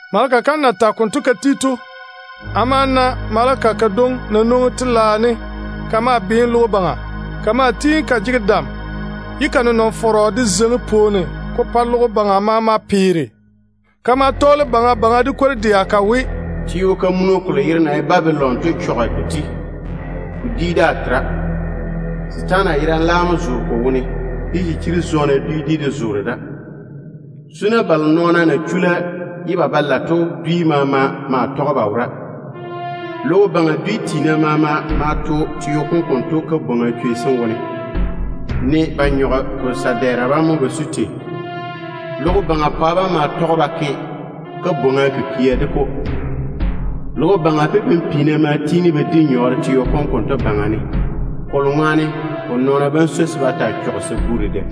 Maleka kam na tage konto ka ti to, amo ma na maleka kadwoŋi na nwoŋi telaao ne ka maa beene logo baŋa. Ka maa tiini ka jege dam ye ka nenɔŋa kam zeiŋi pwooni ka pa logo baŋa maama peere. Ka ma tɔɔle baŋa baŋa de kwor-dɛa ka we: “Babilon te-fɔrɔ kom chɔge ywoo! Ko yɔɔre ko chɔge mo. Setaana yerane laam mo zoore ko wone, ye chichiri-zɔɔna dwi maama de zoore da. Zuna de vara balo nɔɔna na chula ye ba ba lae to dwi maama maa tɔge ba wora. Logo baŋa dwi tiina maama ma to teo kom konto kabwoŋa chwei sem wone, ne ba nyɔge ko sa-dɛɛra mo ba su tei. Logo baŋa pwa bam ma tɔge ba ke bwoorim de-ko. Logo baŋa pipim-piina ma tiini ba di nyɔɔre teo kom konto baŋa ne, kolo ŋwaane ko nɔɔna bam swoi se ba taa chɔge sabu dedɛ.”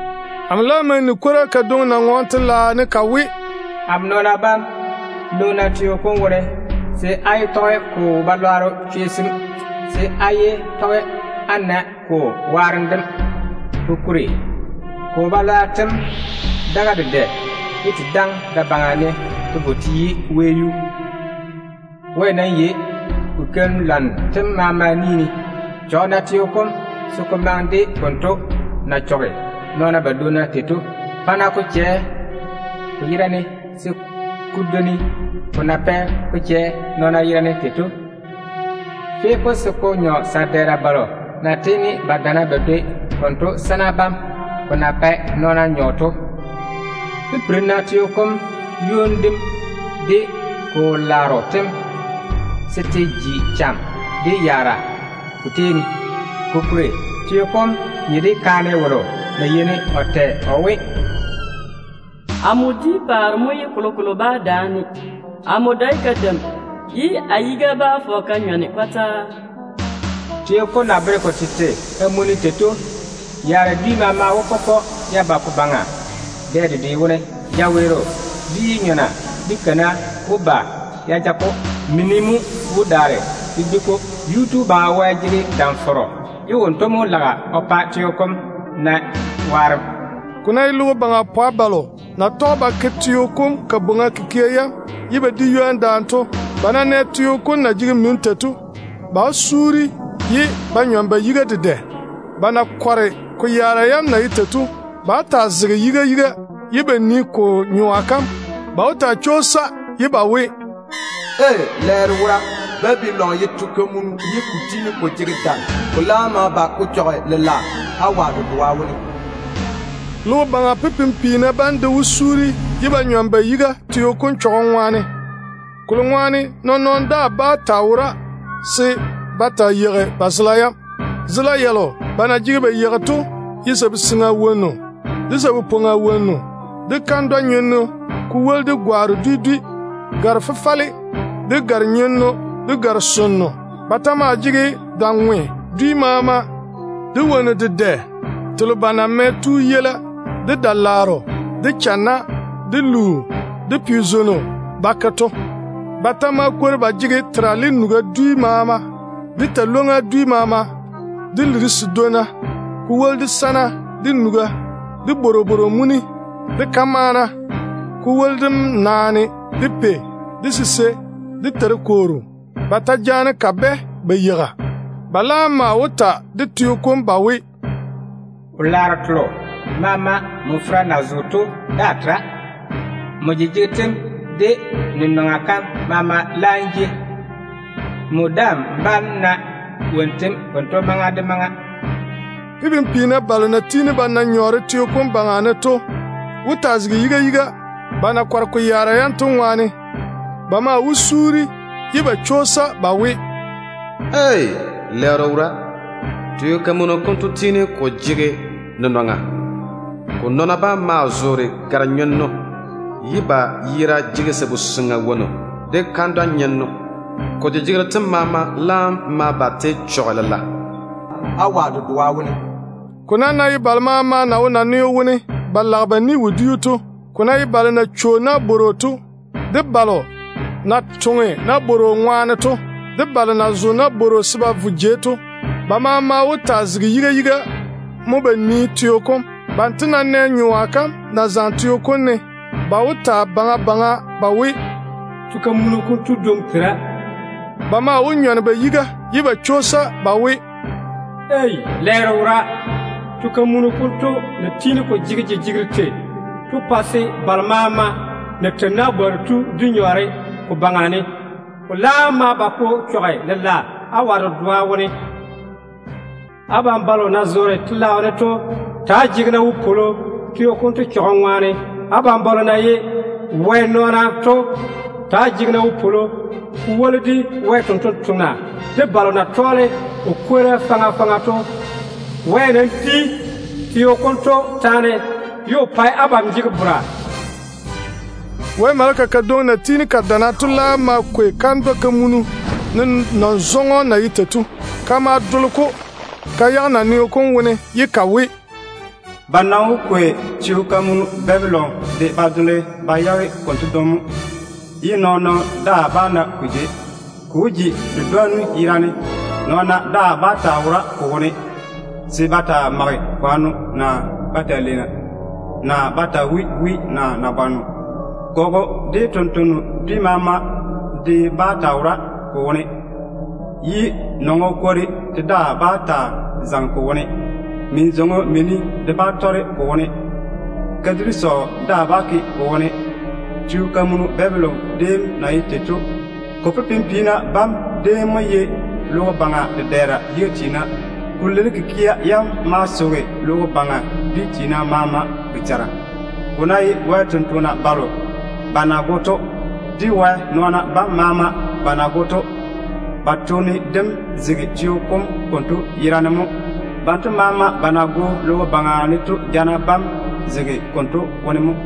Amo laam ma ni kwora kadwoŋi na ŋɔɔne Wɛ telaao ne ka we: “Amo nɔɔna bam, nwoŋi-na teo kom wone, se á yé tɔge ko wo-balwaaro chwei sem, se á yé tɔge á na ko yaara yam. Kokuri ko wɛleera yam daga dedɛ te daŋe da-baŋa ne te yi wɛyuu. Wɛ nam yei ko keim-lwanno tem maama ni ne. Chɔge-na teo kom se ko maŋe de konto na chɔge nɔɔna badwonna tei to. Pa-na ko chɛ ko yera ne se ko dwoni ko na pɛ ko chɛ nɔɔna yera ne tei to. Fe-na-ko se ko nyɔ sa-dɛɛra balo na tiini ba dana ba dwoi konto sana bam ko na pae nɔɔna nyɔ to. Pipiri-na teo kom ywoni dem de ko wo-laaro tem se te jwoori te ji cham de yaara te pa-ko. Kokuri teo kom nye de kaane wolo na yeini o tɛ o we, ‘Amo di paare mo ye kolokolo daa bá daane-ne. Amo dae kadeim, ye a yiga bá fɔge ka nyɔne.’ Teo kom na bere ko tete kamunni to ŋwaane, yaara dwi maama wó pɔpɔ ya ba ko baŋa dɛ dedwe wone. Jawe-chɛɛro de yi-nyɔna de kana wó ba te ja-ko. Mini de maa wó di-ko. Yuu-tu Baŋa Wɛ jege dam-fɔrɔ, ye wonto mo wó pa teo kom na waarem.” Ko ná ye logo baŋa pwa balo na tɔge ba ke teo kom kabwoŋa kikia yam ye ba di ywoni daane to, ba ná nɛ teo kom na jege mini tei to, ba wó taa keera de wo-chechɔgɔ. Ba na kɔre ko yaara yam to ŋwaane, ba wó taa zege yiga yiga ye ba nii ko nyoa kam. Ba wó taa chwoosa ye ba we: “Ei! Lɛɛro wora! Lɛɛro yi te-fɔrɔ kom! Babilon ya tiini ko jege dam. Ko laam nam tu ko chɔge lela, awa dedoa wone.” Logo baŋa pipim-piina bam de wó taa keera ye ba nyɔne ba yiga teo kom chɔgem ŋwaane, kolo ŋwaane nɔɔn-nɔɔno daa tera se ba taa yeigi ba zela yam. Zela yalo ba na jege ba yeigi to ye sabu-seŋa wonnu, de lu-nyenno wonnu, de kandwa-nyenno, ko woli de gwaaro dwi dwi, te na ye gare-fefale, de gare-nyenno, de gare-sonno telo na ye chwɛ-chwɛ to mo. Ba ta maa jege da-ŋwe dwi maama, de wonnu dedɛ telo ba na mɛ tuu yeila, de da-laaro, de channa, de luu, de pe-siswollu ba ke to. Ba ta maa kwori ba jege terale nuga dwi maama, de talwoŋ-ywoŋa dwi maama, de liri sedwonna, ko woli de sana, de nuga, de bworobworo muni, de kamaana, ko woli de naane, de pei, de sisei, de se torokooro. Ba ta jaane kabɛ ba yeiga. Ba laam maa wó ta de teo kom ba we, “Wo-laaro telo maama nmo fera na zo to daa tera. Nmo jejegero tem de n nenɔŋa kam maama laam jei. Nmo daa‑n bá‑n na wonnu tem konto maŋa de maŋa.” Pipim-piina balo na tiini ba na nyɔɔre teo kom baŋa ne to wó taa zege yiga yiga, ba na kɔre ko yaara yam to ŋwaane. Ba maa wó taa keera ye ba chwoosa ba we: “Ei! Lɛɛro wora! Teo kamunu konto tiini ko jege nenɔŋa. Ko nɔɔna bam maa zoore gare-nyenno, ye ba yera jege sabu-seŋa wonnu de kandwa-nyenno. Ko jejegero tem maama laam ma ba te chɔge lela, awa dedoa wone.” Ko nam ná ye balo maama na wo naneo wone ba lage ba ni-wodiu to, ko ná ye balo na cho nabworo to, de balo na toŋe nabworo ŋwaane to, de balo na zo nabworo se ba vo jei to, ba maama wó taa zege yiga yiga mo ba nii teo kom. Banto ná nɛ nyoa kam na zaŋe teo kom ne, ba wó ta baŋa baŋa ba we, “Teo kamunu konto dwoŋi tera.” Ba maa wó nyɔne ba yiga, ye ba chwoosa ba we, “Ei! Lɛɛro wora! Lɛɛro yi te-fɔrɔ kom! Ko na tiini ko jege jejegero tei to pɛ se balo maama na tei nabwooru to di nyɔɔre ko baŋa ne. Ko laam ma ba ko chɔge lela, awa dedoa wone.” Abam balo na zoore Wɛ telaao ne to ta‑á chaka de wopwolo teo kom chɔgem dem ŋwaane. Abam balo na ye Wɛ nɔɔna to, ta‑á jege-na wopwolo, ko woli de Wɛ totoŋa nakwa, de o sampwori sem maama. Wɛ mo di teo kom taane, ye o pa abam jege bora. Wɛ maleka kadwoŋi na tiini ka dana to laam ma kwei kandwɛ-kamunu, ne nɔŋ-zɔŋɔ na ye tei to. Ka ma dole-ko ka yage naneo kom wone ye ka we, “Ba nam wó kwei te-fɔrɔ Babilon de ba dole ba yage konto dwoŋi mo, ye nɔɔn-nɔɔno daa bá na ko jei. Ko wó ji di-dwonnu yerane. Nɔɔna daa bá taa wo ko wone se ba taa mage kwanno, naa ba taa leena, naa ba taa wui wi naa nabwanno. Gɔgɔ dwi maama de bá taa wo ko wone, ye nɔŋɔ kwori de daa bá taa zaŋe ko wone. Min-zwoŋo mini de daa bá tɔrege ko wone. Kadiri sɔɔ de daa bá ke ko wone. Te-fɔrɔ kom pipim-piina bam déem mo ye logo baŋa dedɛɛra yiga tiina. Ko liri kikia yam ma soge logo baŋa dwi tiina maama boboŋa. Ko ná ye Wɛ sampwori selo ba na go to, de Wɛ nɔɔna balo maama ba na go to, ba toone dem zege teo kom konto yera ne mo. Balo maama ba na go logo baŋa ne to chao wó jeini teo kom yuu ne mo.”